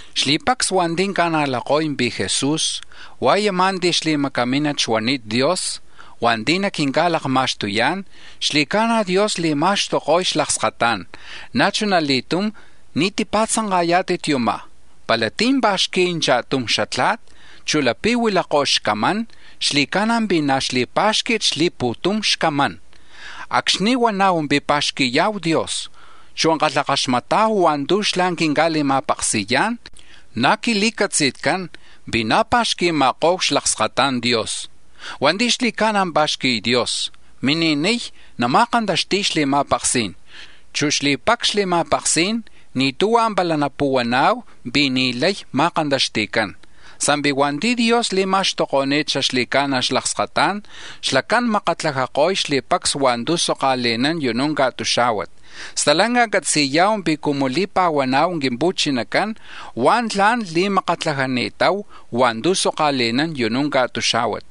Xli̱pacs hua̱nti̱ ca̱najlako̱y pi̱ Jesús hua̱ yumá̱ ti̱ xli̱macamínat xuani̱t Dios, hua̱nti̱ naquinca̱lakma̱xtuyá̱n; xli̱ca̱na̱ Dios li̱ma̱xtuko̱y xlakskatá̱n. Na̱ chuna li̱tum ni̱ tipa̱tzanka̱yá̱tit yumá̱: pala tí̱ pa̱xqui̱y cha̱tum xatla̱t, chu̱ lapi̱ huilakó̱ xlakskatá̱n, xli̱ca̱na̱ pi̱ na̱ xli̱pá̱xqui̱t xlakskatá̱n tama̱ ko̱lutzí̱n. Acxni̱ huana̱hu pi̱ pa̱xqui̱ya̱hu Dios, chu̱ kalhakaxmata̱hu hua̱ntu̱ xlá̱ quinca̱li̱ma̱paksi̱yá̱n, na̱ quili̱catzi̱tcán pi̱ na̱ pa̱xqui̱ma̱ko̱hu xlakskata̱n Dios. Hua̱nti̱ xli̱ca̱na̱ pa̱xqui̱y Dios mini̱niy nama̱kantaxti̱y xli̱ma̱paksí̱n, chu̱ xli̱pacs xli̱ma̱paksí̱n ni̱ tuhua̱ pala napuhuana̱hu pi̱ ni̱ lay ma̱kantaxti̱cán. Sa̱mpi̱ hua̱nti̱ Dios li̱ma̱xtuko̱ni̱t xaxli̱ca̱na̱ xlakskatá̱n, xlacán makatlajako̱y xli̱pacs hua̱ntu̱ soka̱li̱nán u̱nú̱ ca̱tuxá̱huat; stalanca catzi̱ya̱hu pi̱ cumu li̱pa̱huana̱hu Quimpu̱chinacán, huá̱ tla̱n li̱makatlajani̱tahu hua̱ntu̱ soka̱li̱nán u̱nú̱ ca̱tuxá̱huat.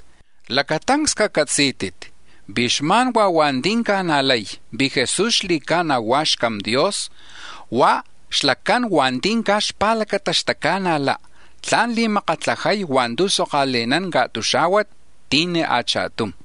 Lacatancs cacatzí̱tit pi̱ xma̱n huá̱ hua̱nti̱ ca̱najlay pi̱ Jesús xli̱ca̱na̱ hua̱ xCam Dios, hua̱ xlacán hua̱nti̱ caj xpa̱lacata xtaca̱najla̱ tla̱n li̱makatlajay hua̱ntu̱ soka̱li̱nán ca̱tuxá̱huat, ti̱ni̱ a̱cha̱tum.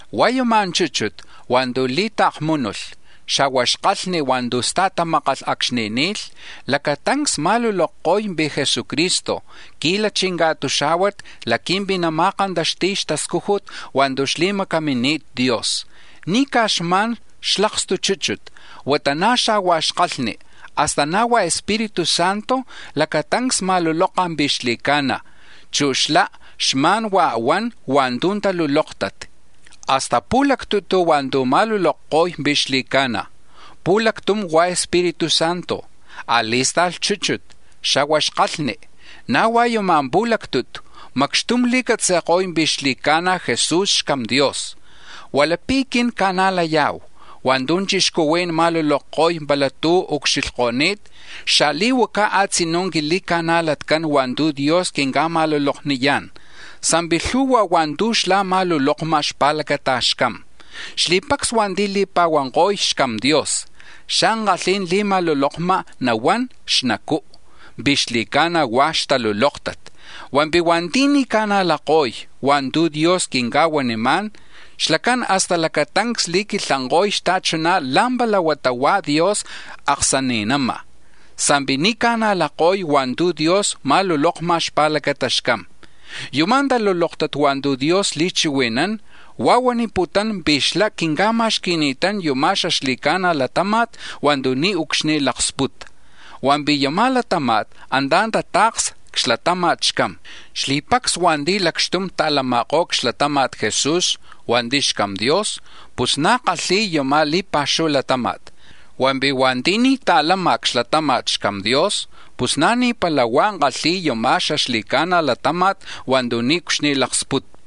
Hua̱ yuma̱ chúchut hua̱ntu̱ li̱ta̱kmúnulh, xa̱huá̱ xkalhni̱ hua̱ntu̱ stajmákalh acxni̱ ni̱lh, lacatancs ma̱lulokko̱y pi̱ Jesucristo qui̱lachi̱ ca̱tuxá̱huat laqui̱mpi̱ nama̱kantaxti̱y xtascújut hua̱ntu̱ xli̱macamini̱t Dios; ni̱ caj xma̱n xlakstu chúchut, huata na̱ xa̱hua̱ xkalhni, hasta na̱ hua̱ Espíritu Santo lacatancs ma̱luloka̱ pi̱ xli̱ca̱na̱, chu̱ xlá̱ xma̱n huá̱ huan hua̱ntu̱ talulóktat. Hasta pu̱lactutu̱ tu̱ ma̱lulokko̱y pi̱ xli̱ca̱na̱: pu̱lactum hua̱ Espíritu Santo, a̱li̱sta̱lh chúchut, xa̱hua̱ kalhni; na̱ hua̱ yuma̱ pu̱lactutu̱ macxtum li̱catzi̱ko̱y pi̱ xli̱ca̱na̱ Jesús xCam Dios. Hua̱ lapi̱ quin ca̱najlaya̱hu hua̱ntu̱ chixcuhuí̱n ma̱lulokko̱y pala tú̱ ucxilhko̱ni̱t, xali̱huaca tlak tla̱n quili̱ca̱najlatcán hua̱ntu̱ Dios quinca̱ma̱lulokniyá̱n, sa̱mpi̱ lhu̱hua̱ hua̱ntu̱ xlá̱ ma̱lulokma̱ xpa̱lacata xCam. Xli̱pacs hua̱nti̱ li̱pa̱huanko̱y xCam Dios xa̱li̱ankalhí̱n li̱ma̱lulokma̱ nahuán xnacú̱ pi̱ xli̱ca̱na̱ hua̱ xtalulóktat; hua̱mpi̱ hua̱nti̱ ni̱ ca̱najlako̱y hua̱ntu̱ Dios quinca̱huanimá̱n, xlacán hasta lacatancs li̱quilhanko̱y xta̱chuná̱ la̱mpala huata hua̱ Dios xaaksani̱ná, sa̱mpi̱ ni̱ ca̱najlako̱y hua̱ntu̱ Dios ma̱lulokma̱ xpa̱lacata̱ xCam. Yuma̱ talulóktat hua̱ntu̱ Dios li̱chihui̱nán, huá̱ huaniputún pi̱ xlá̱ quinca̱ma̱xqui̱ni̱tán yuma̱ xaxli̱ca̱na̱ latáma̱t hua̱ntu̱ niucxni̱ laksputa, hua̱mpi̱ yuma̱ latáma̱t antá̱ nata̱ksa̱hu c-xlatama̱t xCam. Xli̱pacs hua̱nti̱ kalhi̱y c-xlatama̱tcán Jesús hua̱nti̱ xCam Dios, pus na̱ kalhi̱y yuma̱ li̱pa̱xuhu latáma̱t; hua̱mpi̱ hua̱nti̱ ni̱ kalhi̱y c-xlatama̱t xCam Dios pus na̱ ni̱mpala huá̱ kalhi̱y yuma̱ xaxli̱ca̱na̱ latáma̱t hua̱ntu̱ niucxnicú̱ laksputa.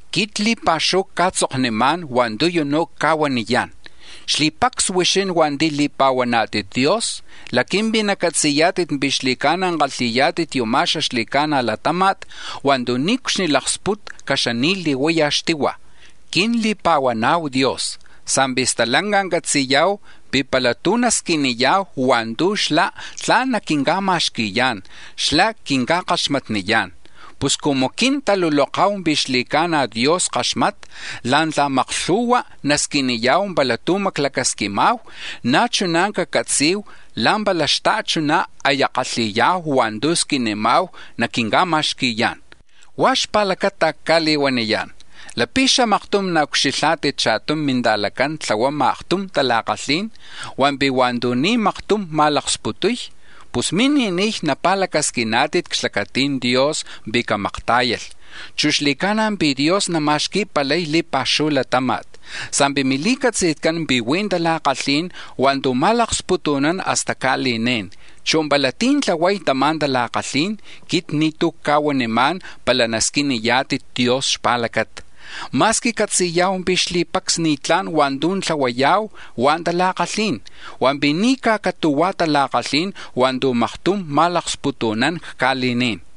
Quit li̱pa̱xuhu cca̱tzoknimá̱n hua̱ntu̱ u̱nú̱ cca̱huaniyá̱n xli̱pacs huixín hua̱nti̱ li̱pa̱huaná̱tit Dios laqui̱mpi̱ nacatzi̱yá̱tit pi̱ xli̱ca̱na̱ kalhi̱yá̱tit yuma̱ xaxli̱ca̱na̱ latáma̱t hua̱ntu̱ niucxnicú̱ laksputa̱ caxani̱li̱huaya̱ xtihua̱. Quin li̱pa̱huana̱hu Dios sa̱mpi̱ stalanca catzi̱ya̱hu pi̱ pala tú̱ nasquiniya̱hu hua̱ntu̱ xlá̱ tla̱n naquinca̱ma̱xqui̱yá̱n, xlá̱ quinca̱kaxmatniyá̱n. Pus cumu quin taluloka̱hu pi̱ xli̱ca̱na̱ Dios kaxmata̱ la̱ntla̱ta maklhu̱hua̱ nasquiniya̱hu pala tú̱ maclacasquima̱hu, na̱ chuná̱ cacatzi̱hu la̱mpala xta̱chuná̱ aya kalhi̱ya̱hu hua̱ntu̱ squinima̱hu naquinca̱ma̱xqui̱yá̱n. Huá̱ xpa̱lacata cca̱li̱huaniyá̱n, lapi̱ xamaktum naucxilhá̱tit cha̱tum minta̱lacán tlahuama̱ aktum tala̱kalhí̱n, hua̱mpi̱ hua̱ntu̱ ni̱ maktum ma̱laksputuy, pus mini̱niy napa̱lacasquiná̱tit c-xlacati̱n Dios pi̱ camaktá̱yalh, chu̱ xli̱ca̱na̱ pi̱ Dios nama̱xquipalay li̱pa̱xuhu latáma̱t. Sa̱mpi̱ mili̱catzi̱tcán pi̱ huí̱ tala̱kalhí̱n hua̱ntu̱ nama̱laksputu̱nán hasta ca̱li̱ní̱n, chu̱ pala tí̱ tlahuay tama̱ tala̱kalhí̱n quit ni̱tú̱ cca̱huanimá̱n pala nasquiniyá̱tit Dios xpa̱lacata. Ma̱squi catzi̱ya̱hu pi̱ xli̱pacs ni̱tlá̱n hua̱ntu̱ tlahuaya̱hu, huá̱ tala̱kalhí̱n, hua̱mpi̱ ni̱ caj catu̱hua̱ tala̱kalhí̱n hua̱ntu̱ maktum ma̱laksputu̱nán ca̱li̱ní̱n.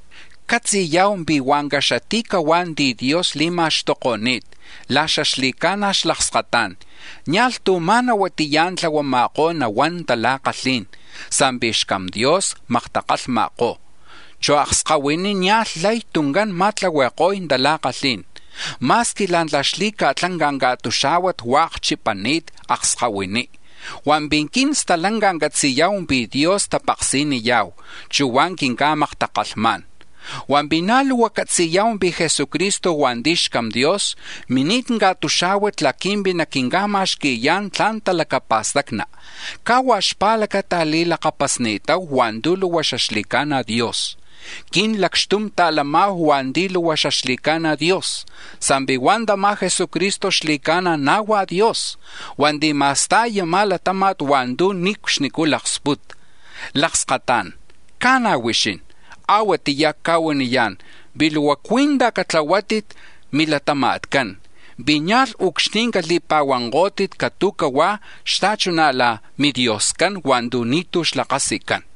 Catzi̱ya̱hu pi̱ hua̱ caxati̱cahuá̱ ti̱ Dios li̱ma̱xtuko̱ni̱t la̱ xaxli̱ca̱na̱ xlakskatá̱n, nia̱lh tú̱ ma̱na huatiyá̱ tlahuama̱kó̱ nahuán tala̱kalhí̱n, sa̱mpi̱ xCam Dios maktakalhma̱kó̱, chu̱ akskahuiní̱ nia̱lh lay tuncán nama̱tlahui̱ko̱y tala̱kalhí̱n. Ma̱squi la̱ntla̱ xli̱ca̱tlanca̱ ca̱tuxá̱huat huá̱ akchipa̱nani̱t akskahuiní, hua̱mpi̱ quin stalanca catzi̱ya̱hu pi̱ Dios tapaksi̱niya̱hu, chu̱ huá̱ quinca̱maktakalhmá̱n. Hua̱mpi̱ na̱ luhua catzi̱ya̱hu pi̱ Jesucristo hua̱nti̱ xCam Dios, mini̱t ca̱tuxá̱huat laqui̱mpi̱ naquinca̱ma̱xqui̱yá̱n tla̱n talacapa̱stacni̱ caj huá̱ xpa̱lacata li̱lakapasni̱tahu hua̱ntu̱ luhua xaxli̱ca̱na̱ Dios. Quin lacxtum ta̱lama̱hu hua̱nti̱ luhua xaxli̱ca̱na̱ Dios, sa̱mpi̱ hua̱ tama̱ Jesucristo xli̱ca̱na̱ na̱ hua̱ Dios hua̱nti̱ ma̱sta̱y yuma̱ latáma̱t hua̱ntu̱ niucxnicú̱ laksputa. Lakskatá̱n, ca̱na̱ huixín, a̱huatiyá̱ cca̱huaniyá̱n pi̱ luhua cui̱ntaj catlahuátit milatama̱tcán pi̱ nia̱lh ucxni̱ cali̱pa̱huankó̱tit catu̱huá̱ xta̱chuná̱ la̱ midioscán hua̱ntu̱ ni̱tú̱ xlakasicán.